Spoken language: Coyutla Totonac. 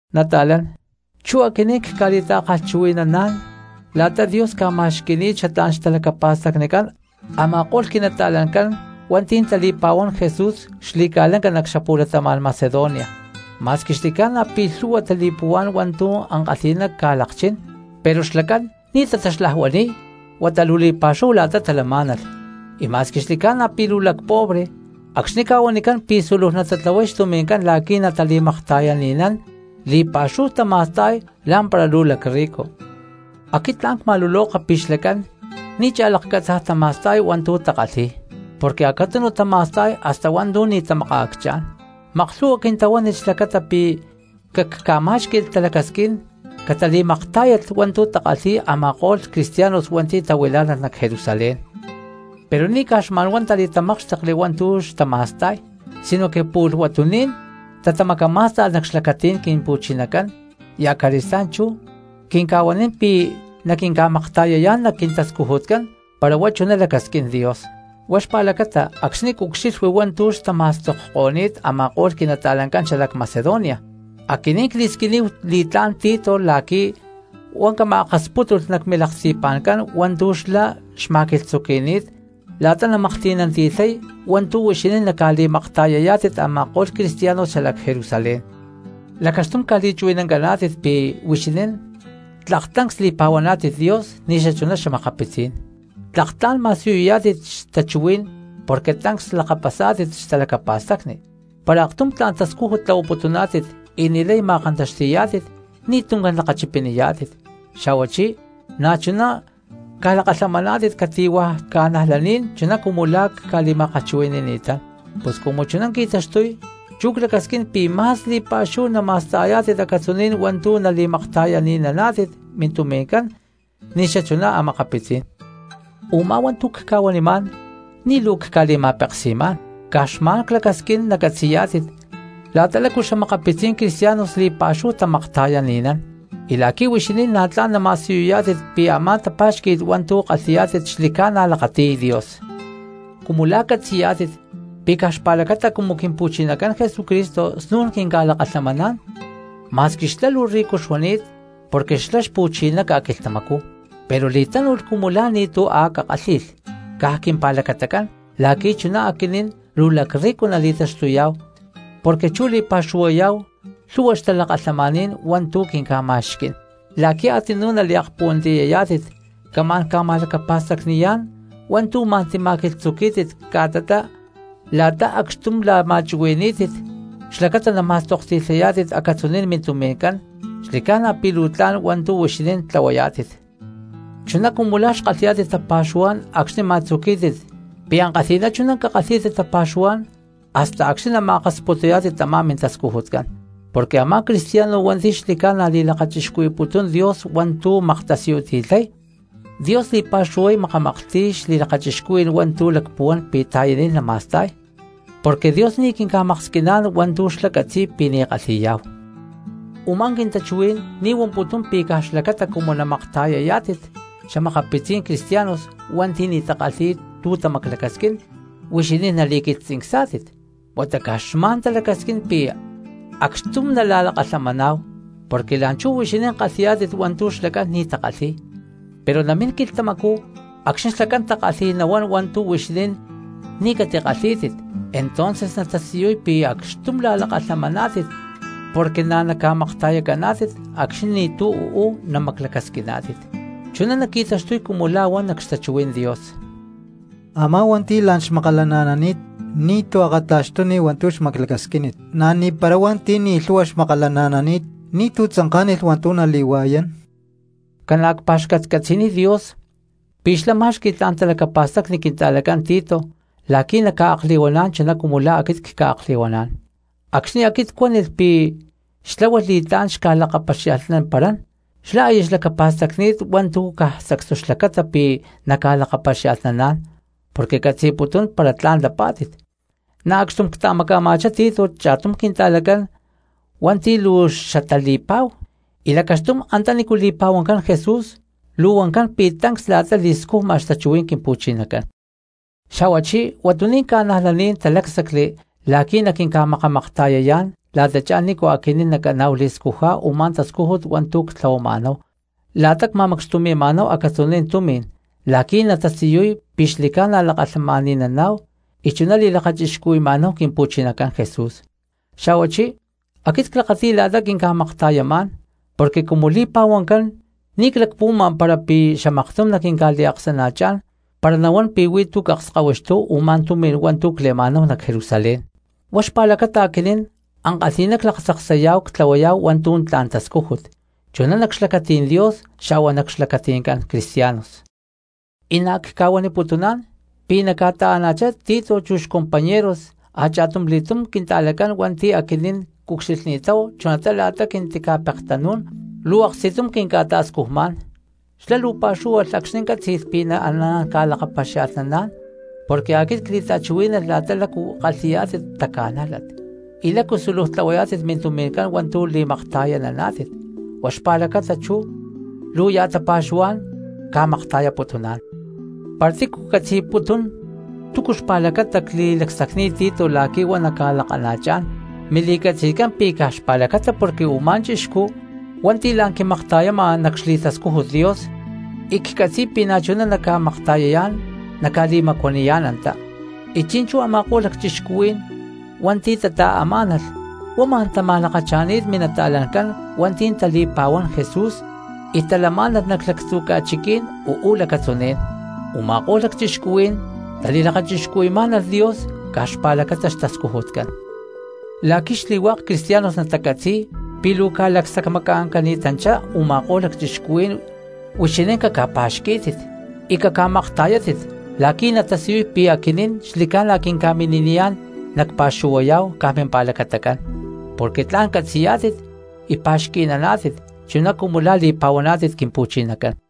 Nata̠lán, chú aquinín cca̠li̠ta̠kalhchuhui̠naná̠n la̠ta Dios ca̠ma̠xqui̠ni̠t xatlá̠n xtalacapa̠stacnicán a̠ma̠ko̠lh quinata̠lancán hua̠nti̠ tali̠pa̠huán Jesús xli̠ca̠lanca nac xapu̠latama̠n Macedonia. Ma̠squi xli̠ca̠na pí lhu̠hua tali̠puhuá̠n hua̠ntu̠ ankalhi̠ná ca̠lakchín pero xlacán ni̠ tataxlajuani̠y huata luu li̠pa̠xu̠hu la̠ta talamá̠nalh; y ma̠squi xli̠ca̠na pi̠ luu lacpobre, acxni̠ ca̠huanicán pi̠ súluj natatlahuay xtumi̠ncán la̠qui̠ natali̠makta̠yani̠nán, li̠pa̠xúhu tama̠sta̠y lá̠mpara luu lacrrico. Aquit tla̠n cma̠luloka pi̠ xlacán ni̠ cha̠lakcatza̠naj tama̠sta̠y hua̠ntu̠ takalhi̠y porque acatunu tama̠sta̠y hasta hua̠ntu̠ ni̠ tamakaakchá̠n. Maklhu̠hua quintahuánilh xlacata pi̠ cacca̠má̠xqui̠lh talacasquín catali̠maktá̠yalh hua̠ntu̠ takalhi̠y a̠ma̠ko̠lh cristianos hua̠nti̠ tahuilá̠nalh nac Jerusalén. Pero ni̠ caj xma̠nhuá tali̠tamákxtekli hua̠ntu̠ xtama̠sta̠y, sinoque pu̠lh huatuní̠n tatamacamá̠sta̠lh nac xlacatí̠n Quimpu̠chinacán y acali̠stá̠n chú quinca̠huanín pi̠ naquinca̠makta̠yayá̠n nac quintascujutcán para huá chuná lacasquín Dios. Huá xpa̠lacata acxni̠ cucxilhui hua̠ntu̠ xtama̠stokko̠ni̠t a̠ma̠ko̠lh quinata̠lancán xalac Macedonia, aquinín cli̠squiníhu li̠tlá̠n Tito la̠qui̠ huá na̠ cama̠akaspútulh nac milaksti̠pa̠ncán hua̠ntu̠ xlá xma̠quilhtzuqui̠ni̠t la̠ta namaklhti̠nanti̠lhay hua̠ntu̠ huixinín naca̠li̠makta̠yayá̠tit a̠ma̠ko̠lh cristianos xalac Jerusalén. Lacaxtum ca̠li̠chuhui̠nancaná̠tit pi̠ huixinín tlak tancs li̠pa̠huaná̠tit Dios ni̠xachuná xa̠makapitzí̠n, tlak tla̠n ma̠siyuyá̠tit xtachuhuí̠n porque tancs lakapasá̠tit xtalacapa̠stacni, para aktum tla̠n tascújut tlahuaputuná̠tit y ni̠lay ma̠kantaxti̠yá̠tit ni̠ tuncán lakachipiniyá̠tit, xa̠huachí na̠chuná ca̠lakalhamaná̠tit cati̠hua̠ cristianos chuná cumu la̠ cca̠li̠ma̠kalhchuhui̠ni̠ni̠tán. Pus cumu chuná qui̠taxtuy, chú clacasquín pi̠ ma̠s li̠pa̠xúhu nama̠sta̠yá̠tit acatzuní̠n hua̠ntu̠ nali̠makta̠yani̠naná̠tit mintumi̠ncán ni̠xachuná a̠makapitzí̠n. Umá hua̠ntu̠ cca̠huanimá̠n ni̠ luu cca̠li̠ma̠peksi̠má̠n, caj xma̠n clacasquín nacatzi̠yá̠tit la̠ta lácu xa̠makapitzí̠n cristianos li̠pa̠xúhu tamakta̠yani̠nán, y la̠qui̠ huixinín na̠ tla̠n nama̠siyuyá̠tit pi̠ a̠má tapa̠xqui̠t hua̠ntu̠ kalhi̠yá̠tit xli̠ca̠na hua̠ntu̠ lakati̠y Dios. Cumu la̠ catzi̠yá̠tit pi̠ caj xpa̠lacata cumu Quimpu̠chinacán Jesucristo snu̠n quinca̠lakalhamaná̠n, ma̠squi xlá luu rico xuani̠t porque xlá xpu̠chiná ca̠quilhtamacú, pero li̠tánu̠lh cumu la̠ ni̠tu̠ a̠ cakálhi̠lh caj quimpá̠lacatacán la̠qui̠ chuná aquinín luu lacrrico nali̠taxtuyá̠hu porque chú li̠pa̠xuhuayá̠hu lhu̠hua xtalakalhamaní̠n hua̠ntu̠ quinca̠ma̠xquí̠n. La̠qui̠ a̠tzinú naliakpuhuantiyayá̠tit camá̠n ca̠ma̠lacapa̠stacni̠yá̠n hua̠ntu̠ ma̠n tima̠quilhtzuquí̠tit ca̠tatá la̠ta acxtum la̠ma̠chuhui̠ní̠tit xlacata nama̠stokti̠lhayá̠tit acatzuní̠n mintumi̠ncán, xli̠ca̠na pi̠ luu tla̠n hua̠ntu̠ huixinín tlahuayá̠tit. Chuná cumu la̠ xkalhi̠yá̠tit tapa̠xuhuá̠n acxni̠ ma̠tzuquí̠tit pi̠ ankalhi̠ná chuná cakalhí̠tit tapa̠xuhuá̠n hasta acxni̠ nama̠akasputuyá̠tit tamá mintascujutcán. Porque a̠má cristiano hua̠nti̠ xli̠ca̠na li̠lakachixcuhui̠putún Dios hua̠ntu̠ maktasiyuti̠lhay, Dios li̠pa̠xúhu makamaklhti̠y xli̠lakachixcuhuí̠n hua̠ntu̠ lacpuhuán pi̠ ta̠yaniy nama̠sta̠y, porque Dios ni̠ quinca̠maksquiná̠n hua̠ntu̠ xlá catzi̠y pi̠ ní kalhi̠yá̠hu. Umá quintachuhuí̠n ni̠ huamputún pi̠ caj xlacata cumu naca̠makta̠yayá̠tit xa̠makapitzí̠n cristianos hua̠nti̠ ni̠ takalhi̠y tu̠ tamaclacasquín huixinín nali̠quilhtzincsá̠tit, huata caj xma̠n talacasquín pi̠ acxtum nala̠lakalhamaná̠hu, porque la̠nchú huixinín kalhi̠yá̠tit hua̠ntu̠ xlacán ni̠ takalhíy, pero namín quilhtamacú acxni̠ xlacán takalhi̠y nahuán hua̠ntu̠ huixinín ni̠ catikalhí̠tit entonces natasiyuy pi̠ acxtum la̠lakalhamaná̠tit porque na̠ naca̠makta̠yacaná̠tit acxni̠ ni̠tu̠ u̠ú namaclacasquiná̠tit. Chuná naqui̠taxtuy cumu la̠ huan nac xtachuhuí̠n Dios: “Amá hua̠nti̠ la̠n xmakalana̠nani̠t ni̠ akata̠xtúnilh hua̠ntu̠ xmaclacasquínit, na̠ ni̠para hua̠nti̠ ni̠ lhu̠hua xmakalana̠nani̠t ni̠tu̠ tzanká̠nilh hua̠ntu̠ nali̠hua̠yán.” Ca̠na cpa̠xcatcatzi̠niy Dios pi̠ xlá má̠xqui̠lh tla̠n talacapa̠stacni quinta̠lacán Tito la̠qui̠ na̠ naca̠akli̠huaná̠n chuná cumu la̠ aquit cca̠akli̠huaná̠n. Acxni̠ aquit cuánilh pi̠ xtláhualh li̠tlá̠n xca̠lakapaxia̠lhnamparán xlá aya xlacapa̠stacni̠t hua̠ntu̠ caj sacstu xlacata pi̠ naca̠lakapaxia̠lhnaná̠n porque catzi̠putún para tla̠n lapá̠tit. Na̠ acxtum cta̠maca̠ma̠chá Tito cha̠tum quinta̠lacán hua̠nti̠ luu xatali̠pa̠hu y lacaxtum antanícu li̠pa̠huancán Jesús luu huancán pi̠ tancs la̠ta li̠scujma xtachuhuí̠n Quimpu̠chinacán. Xa̠huachí huatuní̠n ca̠najlaní̠n talácsacli la̠qui̠ naquinca̠makamakta̠yayá̠n la̠tachá nícu aquinín nacaná̠hu li̠scujá̠hu u̠má tascújut hua̠ntu̠ ctlahuama̠náhu la̠ta cma̠macxtumi̠ma̠náhu acatzuní̠n tumi̠n la̠qui̠ natasiyuy pi̠ xli̠ca̠na lakalhamani̠naná̠hu y chuná li̠lakachixcuhui̠ma̠náhu Quimpu̠chinacán Jesús. Xa̠huachí aquit clakati̠y la̠ta quinca̠makta̠yamá̠n porque cumu li̠pa̠huancán ni̠ clacpuhuama para xamaktum naquinca̠liaksana̠chá̠n para nahuán pi̠ huí tu̠ cakskahuixtúhu u̠má tumi̠n hua̠ntu̠ cle̠ma̠náhu nac Jerusalén. Huá xpa̠lacata aquinín ankalhi̠ná claktzaksayá̠hu ctlahuayá̠hu hua̠ntu̠ tla̠n tascújut, chuná nac xlacatí̠n Dios xa̠hua nac xlacati̠ncán cristianos. Y na̠ cca̠huaniputuná̠n pi̠ na̠ ca̠ta̠ama̠chá Tito chu xcompañeros a̠cha̠tumli̠túm quinta̠lacán hua̠nti̠ aquinín cucxilhni̠táhu chunatá la̠ta quintica̠pektanú̠n luu aksti̠tum quinca̠ta̠scujmá̠n, xlá luu pa̠xúhualh acxni̠ cátzi̠lh pi̠ naaná̠n ca̠lakapaxia̠lhnaná̠n porque aquit cli̠ta̠chuhui̠nani̠t la̠ta lácu kalhi̠yá̠tit taca̠nájlat, y lácu súluj tlahuayá̠tit mintumi̠ncán hua̠ntu̠ li̠makta̠yananá̠tit, huá xpa̠lacata chú luu ya̠ tapa̠xuhuá̠n ca̠makta̠yaputuná̠n. Para tícu catzi̠putún túcu xpa̠lacata cli̠lacsacni̠t Tito la̠qui̠ huá naca̠lakana̠chá̠n mili̠catzi̠tcán pi̠ caj xpa̠lacata porque u̠má chixcú hua̠nti̠ la̠n quimakta̠yama nac xli̠tascújut Dios y ccatzi̠y pi̠ na̠chuná naca̠makta̠yayá̠n naca̠li̠macuaniyá̠n antá; y chi̠nchú a̠ma̠ko̠lh lacchixcuhuí̠n hua̠nti̠ tata̠amá̠nalh huá ma̠n tama̠lakacha̠ni̠t minata̠lancán hua̠nti̠ tali̠pa̠huán Jesús y talamá̠nalh nac lactzu̠ ca̠chiquí̠n uú lacatzuní̠n. Uma̠kó̠lh lacchixcuhuí̠n tali̠lakachixcuhui̠má̠nalh Dios caj xpa̠lacata xtascujutcán. La̠qui̠ xli̠hua̠k cristianos natacatzi̠y pi̠ luu ca̠lacsacmaca̠ncani̠tanchá u̠ma̠ko̠lh lacchixcuhuí̠n huixinín caca̠pa̠xquí̠tit y caca̠makta̠yátit la̠qui̠ natasiyuy pi̠ aquinín xli̠ca̠na quinca̠mini̠niyá̠n nacpa̠xuhuayá̠hu caj mimpa̠lacatacán porque tla̠n catzi̠yá̠tit y pa̠xqui̠naná̠tit chuná cumu la̠ li̠pa̠huaná̠tit Quimpu̠chinacán.